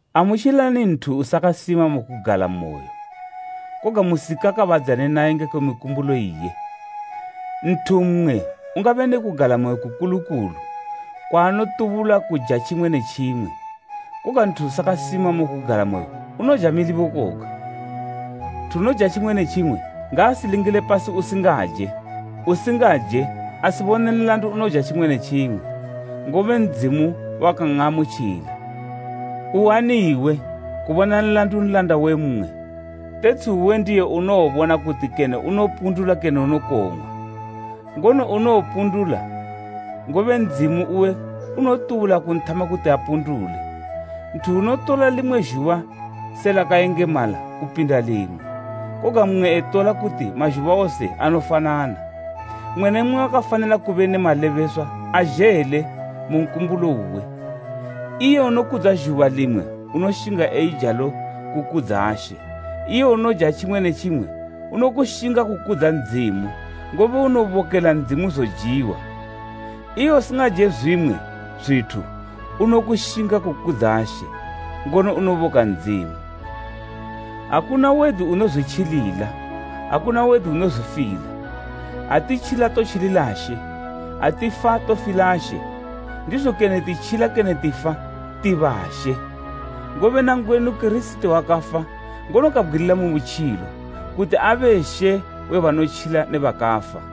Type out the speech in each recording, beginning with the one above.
Amutjilani nthu usakasima mu kugalamoyo, koga musikakabadzane naye ngekwe mikumbulo iye. Nthu mmwe ungabe ne kugalamoyo kukulu kulu kwaanotubula kuja tjimwe ne tjimwe, koga nthu usakasima mu kugalamoyo unoja milibo koga. Nthu unoja tjimwe ne tjimwe ngaasilingile pasi usingaje, usingaje asibone nlandu unoja tjimwe ne tjimwe, ngobe Ndzimu wakan'amutjila. Uani iwe kubona nlandu nlanda we mmwe? Tetshi uwe ndiye unowobona kuti kene unopundula kene unokong'wa. Ngono unowopundula, ngobe Ndzimu uwe unotubula kunthama kuti apundule. Nthu unotola limwe zhuba se lakayengemala kupinda limwe, koga mmwe etola kuti mazhuba wose anofanana. Mmwe ne mmwe wakafanila kube ne malebeswa azhele mu nkumbulo uwe. Iye unokudza zhuba limwe unoshinga eijalo kukudza She, iye unoja tjimwe ne tjimwe unokushinga kukudza Ndzimu, ngobe unobokela Ndzimu zojiwa. Iye usingaje zwimwe zwithu unokushinga kukudza She, ngono unoboka Ndzimu. Akuna wedu unozwitjilila, akuna wedu unozwifila. Ha titjila totjilila She, ha tifa tofila She. Ndizo kene titjila kene tifa, ti ba She. Ngobe nangwenu Kirisiti wakafa, ngono kabgwilila mu butjilo kuti abe She we banotjila ne bakafa.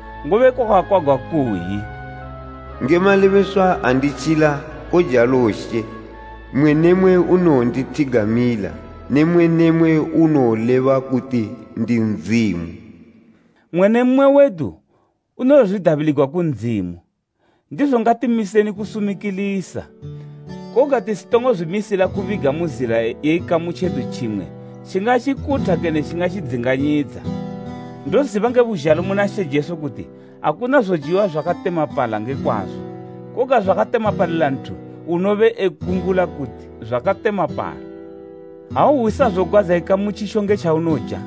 Ngobe kwakakwagwa kukayi, “Nge malebeswa ha nditjila, kojalo She, mmwe ne mmwe unowondithigamila, ne mmwe ne mmwe unowoleba kuti ndi Ndzimu.” Mmwe ne mmwe wedu unowozwidabiligwa ku Ndzimu. Ndizo ngatimiseni kusumikilisa, koga tisitongo zwimisila kubiga mu zila ye ikamu tjedu tjimwe tjingatjikutha kene tjingandzinganyidza. Ndoziba nge buzhalo muna She Jesu kuti akuna zojiwa zwakatemapala nge kwazo, koga zwakatemapalila nthu unobe ekumbula kuti zwakatemapala. Ha uhwisa zogwadza ikamu tjitjo nge tjaunoja,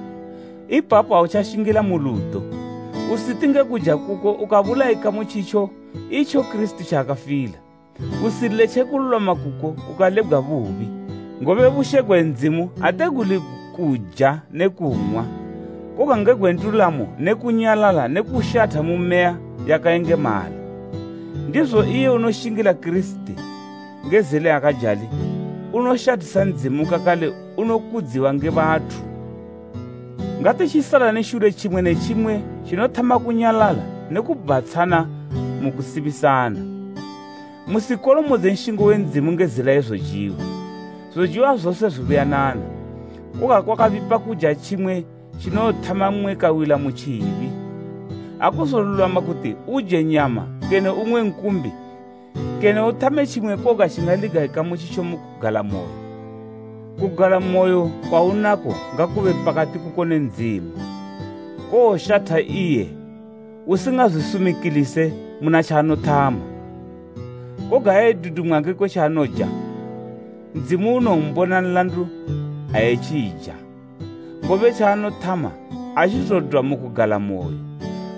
ipapo autjashingila mu ludo. Usiti nge kuja kuko ukabulaya ikamu tjitjo itjo Kirisiti tjaakafila. Usiletje kululwama kuko kukalebgwa bubi, ngobe bushe gwe Ndzimu ate guli kuja ne kung'wa, koga nge gwe ndulamo ne kunyalala ne kushatha mu Meya yakayengemala. Ndizo iye unoshingila Kirisiti nge zila yakajali, unoshathisa Ndzimu kakale unokudziwa nge bathu. Ngatitjisalani shule tjimwe ne tjimwe tjinothama kunyalala ne kubhatshana mu kusimisana. Musikolomodze nshingo we Ndzimu nge zila ye zojiwa. Zojiwa zose zwibuyanana, koga kwakabipa kuja tjimwe tjinowothama mmwe kawila mu tjibi. Akuzolulwama kuti uje nyama kene ung'we nkumbi kene uthame tjimwe koga tjingaliga ikamu tjitjo, kugalamoyo. Kugalamoyo kwaunako ngakube pakati kuko ne Ndzimu. Kowoshatha iye usingazwisumikilise muna tjaanothama. Koga ha edudumwa ngekwe tjaanoja, Ndzimu unombona nlandu ha etjija, ngobe tjaanothama atjizodwa mu kugalamoyo,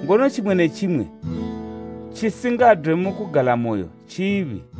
ngono tjimwe ne tjimwe tjisingadwe mu kugalamoyo tjibi.